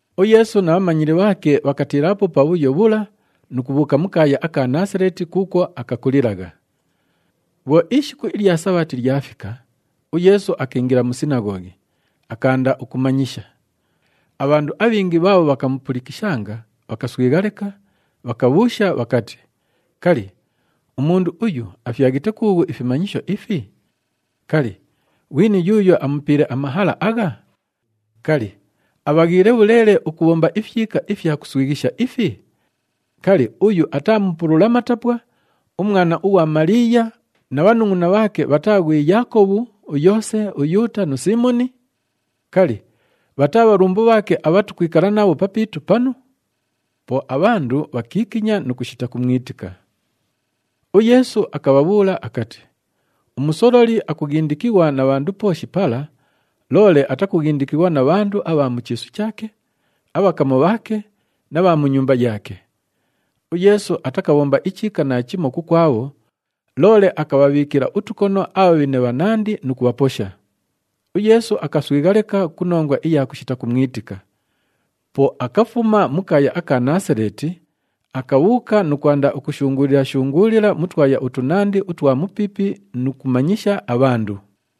UYeesu na bhamanyili bhaake bhakatiilaapo pabhuyo bhula nu kubhuuka mu kaaya aka Naasaleeti kuukwo akakulilagha. Bhwo ishiku ilya Sabhati lyafika, uYeesu akiingila mu sinaghoghi, akaanda ukumanyisha. Abhandu abhingi bhaabho bhakamupulikishanga, bhakaswigha leka, bhakabhuusha bhakati, “Kali, umundu uyu afyaghite kuughu ifimanyisho ifi? Kali, ghwini yuuyo amupiile amahala agha? Kali, abhaghiile bhuleele ukubhomba ifyika ifya kuswighisha ifi? Kali, uyu ataa mupulula matapwa, umwana ughwa Maliiya na bhanungʼuna bhaake bhataa ghwi Yaakobhu, uYoose, uYuuta nu Siimoni? Kali, bhataa bhalumbu bhaake abha tukwikala nabho papiitu panu?” Po abhandu bhakiikinya nu kushita kumwitika. UYeesu akabhabhuula akati, “Umusololi akughindikighwa na bhandu pooshi pala, loole atakughindikighwa na bhandu abha mu chiisu chaake, abhakamu bhaake na bha mu nyumba yaake.” UYeesu atakabhomba ichiika naachimo kukwabho, loole akabhabhiikila utukono abhabhine bhanandi nu kubhaposha. UYeesu akaswigha leka ku nongwa iya kushita kumwitika. Po akafuma mu kaaya aka Naasaleeti, akabhuuka nu kwanda ukushunguulila-shunguulila mu twaya utunandi utwa mupiipi nu kumanyisha abhandu.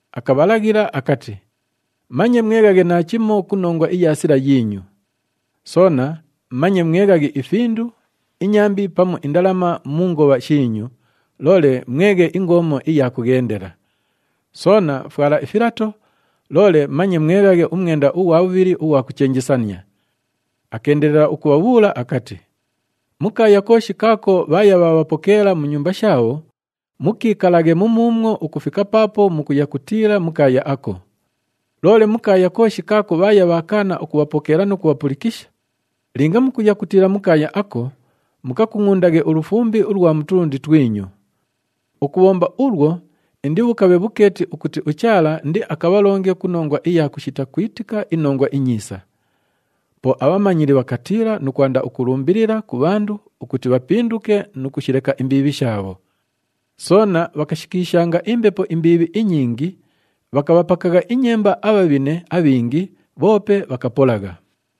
Akabhalaghila akati, “Manye mweghaghe naachimo ku nongwa iya sila yiinyu. Soona manye mweghaghe ifindu, inyambi pamu indalama mu ngobha shiinyu, loole mweghe ingoomo iya kughendela. Soona fwala ifilato, loole manye mweghaghe umwenda ughwa bhubhili ughwa kuchenjesania.” Akeendelela ukubhabhuula akati, “Mu kaaya kooshi kaako bhaaya bhaabhapokeela mu nyumba shaabho, mukiikalaghe mumuumwo ukufika paapo mukuya kutiila mu kaaya ako. Loole mu kaaya kooshi kaako bhaaya bhaakaana ukubhapokeela nu kubhapulikisha, linga mukuya kutiila mu kaaya ako, mukakungʼundaghe ulufumbi ulwa mu tulundi twinyu. Ukubhomba ulwo indibhukabhe bhukeeti ukuti uChaala indiakabhalonge ku nongwa iya kushita kwitika iNongwa iNyiisa.” Po abhamanyili bhakatiila nu kwanda ukulumbilila ku bhandu ukuti bhapinduke nu kushileka imbiibhi shaabho. Soona bhakashikiishanga imbepo imbiibhi inyingi, bhakabhapakagha inyemba abhabhine abhingi, bhoope bhakapolagha.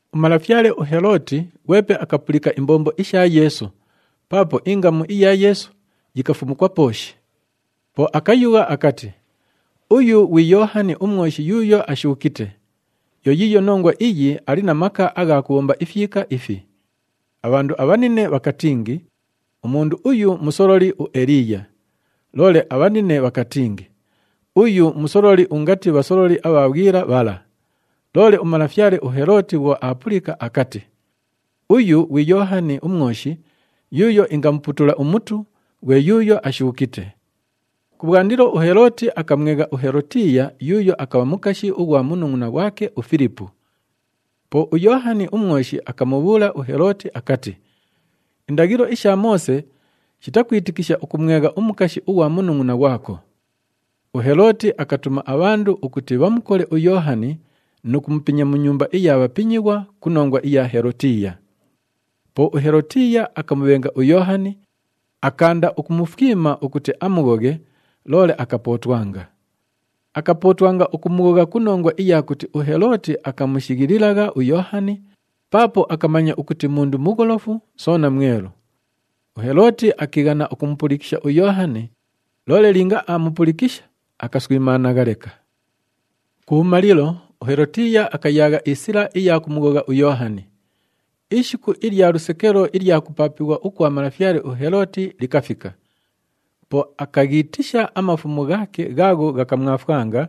Umalafyale uHelooti ghwepe akapulika imbombo isha Yeesu, paapo ingamu iya Yeesu yikafumukwa pooshi. Po akayugha akati, “Uyu ghwi Yoohani uMwoshi yuuyo ashuukite. Yo yiiyo nongwa iyi ali na maka agha kubhomba ifyika ifi.” Abhandu abhanine bhakatingi, “Umundu uyu musololi uEliiya.” Loole abhanine bhakatingi, “Uyu musololi ungati bhasololi abha bhwila bhala.” Loole umalafyale uHelooti bhwo aapulika, akati, “Uyu ghwi Yoohani uMwoshi yuuyo ingamuputula umutu, ghwe yuuyo ashuukite.” Kubhwandilo uHelooti akamwegha uHelotiiya yuuyo akabha mukashi ughwa munungʼuna ghwake uFilipu. Po uYoohani uMwoshi akamubhuula uHelooti akati, “Indaghilo isha Moose shitakwitikisha ukumwegha umukashi ughwa munungʼuna ghwako.” UHelooti akatuma abhandu ukuti bhamukole uYoohani nu kumupinya mu nyumba iya bhapinyighwa ku nongwa iya Helotiiya. Po uHelotiiya akamubhenga uYoohani, akaanda ukumufwima ukuti amughoghe, loole akapootwanga. Akapootwanga ukumughogha ku nongwa iya kuti uHelooti akamushighililagha uYoohani paapo akamanya ukuti mundu mugholofu soona mwelu. UHelooti akiighana ukumupulikisha uYoohani, loole linga aamupulikisha, akaswimaanagha leka. Kubhumalilo, uHelotiiya akayaagha isila iya kumughogha uYoohani. Ishiku ilya lusekelo ilya kupaapighwa ukwa malafyale uHelooti likafika. Po akaghiitisha amafumu ghaake ghaagho ghakamwafwanga,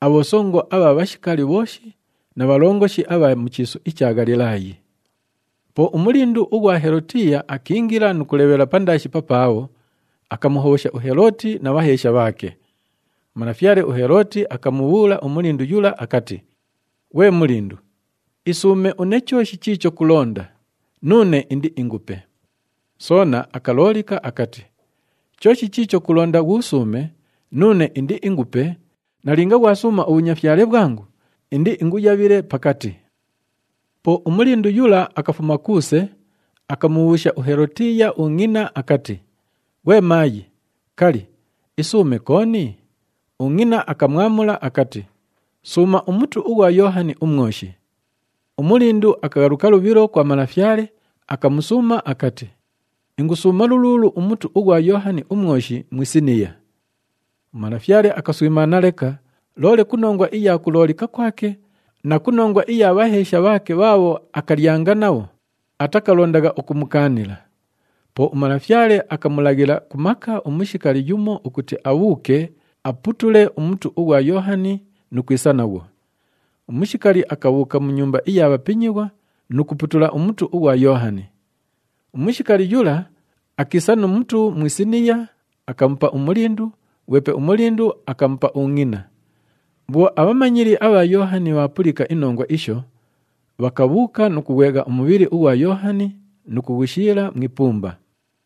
abhosongo abha bhashikali bhooshi na bhalongoshi abha mu chiisu icha Ghalilaayi. Po umulindu ughwa Helotiiya akiingila nu kulebhela pandaashi papaabho, akamuhobhosha uHelooti na bhaheesha bhaake. Umalafyale uHelooti akamubhuula umulindu yula akati, “Ghwe mulindu, isuume une chooshi chiicho kulonda, nuune indiingupe.” Soona akaloolika akati, “Chooshi chiicho kulonda ghuusuume, nuune indiingupe, nalinga ghwasuuma ubhunyafyale bhwangu, indiinguyabhile pakati.” Po umulindu yula akafuma kuuse, akamubhuusha uHelotiiya ungʼina akati, “Ghwe maayi, kali, isuume kooni?” Ungʼina akamwamula akati, “Suuma umutu ughwa Yoohani uMwoshi.” Umulindu akaghaluka lubhilo kwa malafyale, akamusuuma akati, “Ingusuuma luluulu umutu ughwa Yoohani uMwoshi mu isiniya.” Umalafyale akaswimaana leka, loole ku nongwa iya kuloolika kwake na ku nongwa iya bhaheesha bhaake bhaabho akalyanga nabho, atakalondagha ukumukaanila. Po umalafyale akamulaghila ku maka umushikali yumo ukuti abhuuke, aputule umutu ughwa Yoohani nu kwisa naghwo. Umushikali akabhuuka mu nyumba iya bhapinyighwa nu kuputula umutu ughwa Yoohani. Umushikali yula akiisa nu mutu mu isiniya, akamupa umulindu, ghwepe umulindu akamupa ungʼina. Bhwo abhamanyili abha Yoohani bhaapulika inongwa isho, bhakabhuuka nu kughwegha umubhili ughwa Yoohani nu kughushiila mu ipumba.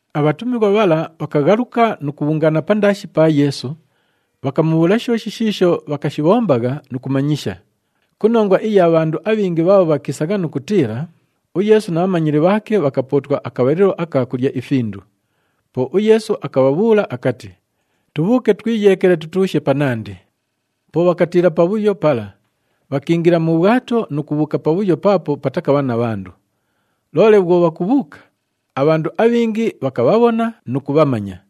Abhatumighwa bhala bhakaghaluka nu kubhungaana pandaashi pa Yeesu, bhakamubhuula shooshi shiisho bhakashibhombagha nu kumanyisha. Ku nongwa iya bhandu abhingi bhaabho bhakiisagha nu kutiila, uYeesu na bhamanyili bhaake bhakapootwa akabhalilo aka kulya ifindu. Po uYeesu akabhabhuula akati, “Tubhuuke twiyeekele, tutuushe panandi.” Po bhakatiila pabhuyo pala, bhakiingila mu bhwato nu kubhuuka pabhuyo paapo patakabha na bhandu. Loole bhwo bhakubhuuka, abhandu abhingi bhakabhabhona nu kubhamanya.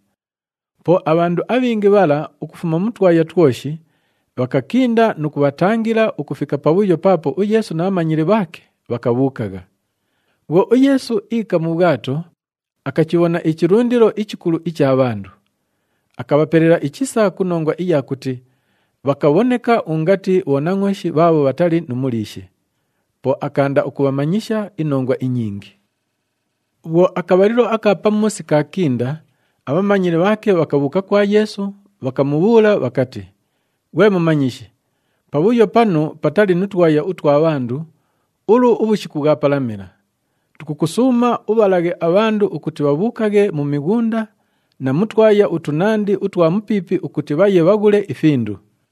Po abhandu abhingi bhala ukufuma mu twaya twoshi, bhakakinda nu kubhatangila ukufika pabhuyo paapo uYeesu na bhamanyili bhaake bhakabhuukagha. Bhwo uYeesu iika mu bhwato, akachibhona ichilundilo ichikulu icha bhandu. Akabhapelela ichisa ku nongwa iya kuti bhakabhoneka ungati bhonangʼooshi bhaabho bhatali nu muliishi. Po akaanda ukubhamanyisha inongwa inyingi. Bhwo akabhalilo aka pamuusi kaakinda, abhamanyili bhaake bhakabhuuka kwa Yeesu, bhakamubhuula bhakati, “Ghwe Mumanyishi, pabhuyo panu patali nu twaya utwa bhandu, ulu ubhushiku bhwapalamila. Tukukusuuma ubhalaghe abhandu ukuti bhabhuukaghe mu mighunda na mu twaya utunandi utwa mupiipi ukuti bhaye bhaghule ifindu.”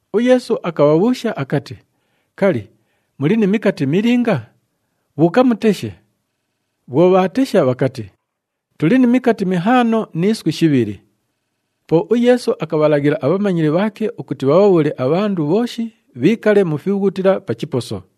UYeesu akabhabhuusha akati, “Kali, muli ni mikati milinga? Bhuuka muteshe.” Bhwo bhaatesha, bhakati, “Tuli ni mikati mihaano ni iswi shibhili.” Po uYeesu akabhalaghila abhamanyili bhaake ukuti bhabhabhuule abhandu bhooshi bhiikale mu fibhughutila pa chiposo.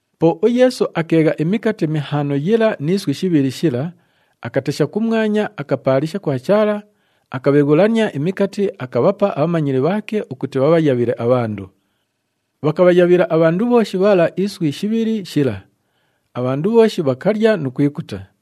Po uYeesu akeegha imikati mihaano yila ni iswi shibhili shila, akatesha kumwanya, akapaalisha kwa Chaala, akabheghulania imikati, akabhapa abhamanyili bhaake ukuti bhabhayabhile abhandu. Bhakabhayabhila abhandu bhooshi bhala iswi shibhili shila. Abhandu bhooshi bhakalya nu kwikuta.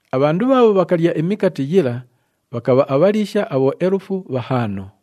Abhandu bhaabho bhakalya imikati yila bhakabha abhaliisha abhoelufu bhahaano.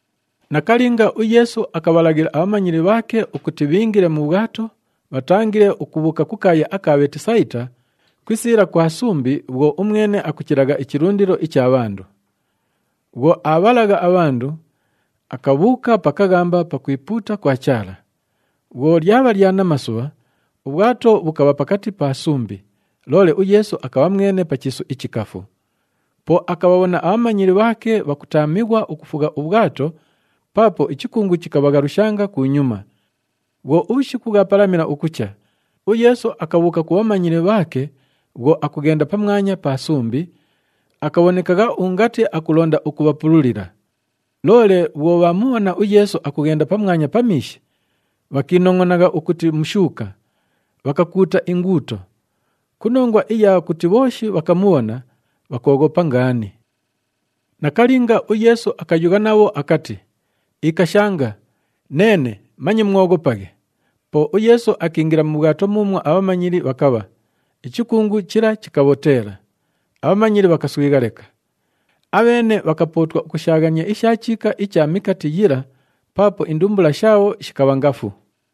Nakalinga, uYeesu akabhalaghila abhamanyili bhaake ukuti bhiingile mu bhwato, bhatangile ukubhuuka ku kaaya aka Bheetisayita, ku isiila kwa sumbi bhwo umwene akuchilagha ichilundilo icha bhandu. Bhwo aabhalagha abhandu, akabhuuka pa kaghamba pakwipuuta kwa Chaala. Bhwo lyabha lya namasubha, ubhwato bhukabha pakati pa sumbi, loole uYeesu akabha mwene pa chiisu ichikafu. Po akabhabhona abhamanyili bhaake bhakutaamighwa ukufugha ubhwato paapo ichikungu chikabhaghalushanga kunyuma. Bhwo ubhushiku bhwapalamila ukucha, uYeesu akabhuuka ku bhamanyili bhaake bhwo akughenda pamwanya pa sumbi, akabhonekagha ungati akulonda ukubhapululila. Loole bhwo bhaamubhona uYeesu akughenda pamwanya pa miishi, bhakiinongʼonagha ukuti mushuuka, bhakakuuta inguuto. Ku nongwa iya kuti bhooshi bhakamubhona, bhakooghopa ngaani. Nakalinga, uYeesu akayugha nabho akati, “Ikashanga, neene, manye mwoghopaghe.” Po uYeesu akiingila mu bhwato muumwo abhamanyili bhakabha, ichikungu chila chikabhoteela. Abhamanyili bhakaswigha leka. Abheene bhakapootwa ukushaaghania isha chiika icha mikati yila paapo indumbula shaabho shikabha ngafu.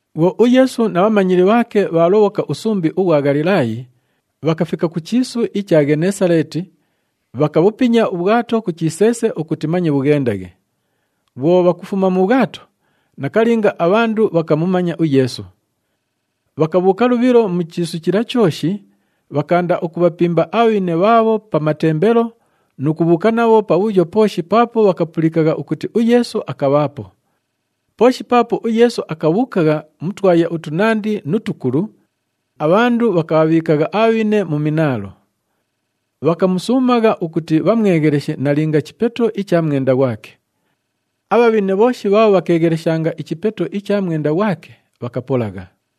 Bhwo uYeesu na bhamanyili bhaake bhaalobhoka usumbi ughwa Ghalilaayi, bhakafika ku chiisu icha Ghenesaleeti, bhakabhupinya ubhwato ku chiseese ukuti manye bhughendaghe. Bhwo bhakufuma mu bhwato, nakalinga abhandu bhakamumanya uYeesu. Bhakabhuuka lubhilo mu chiisu chila chooshi, bhakaanda ukubhapimba abhabhine bhaabho pa matembelo nu kubhuuka nabho pabhuyo pooshi paapo bhakapulikagha ukuti uYeesu akabhaapo. Pooshi paapo uYeesu akabhuukagha mu twaya utunandi nu tukulu, abhandu bhakabhabhiikagha abhabhine mu minaalo. Bhakamusuumagha ukuti bhamwegheleshe nalinga chipeto icha mwenda ghwake. Abhabhine bhooshi bhaabho bhakeegheleshanga ichipeto icha mwenda ghwake, bhakapolagha.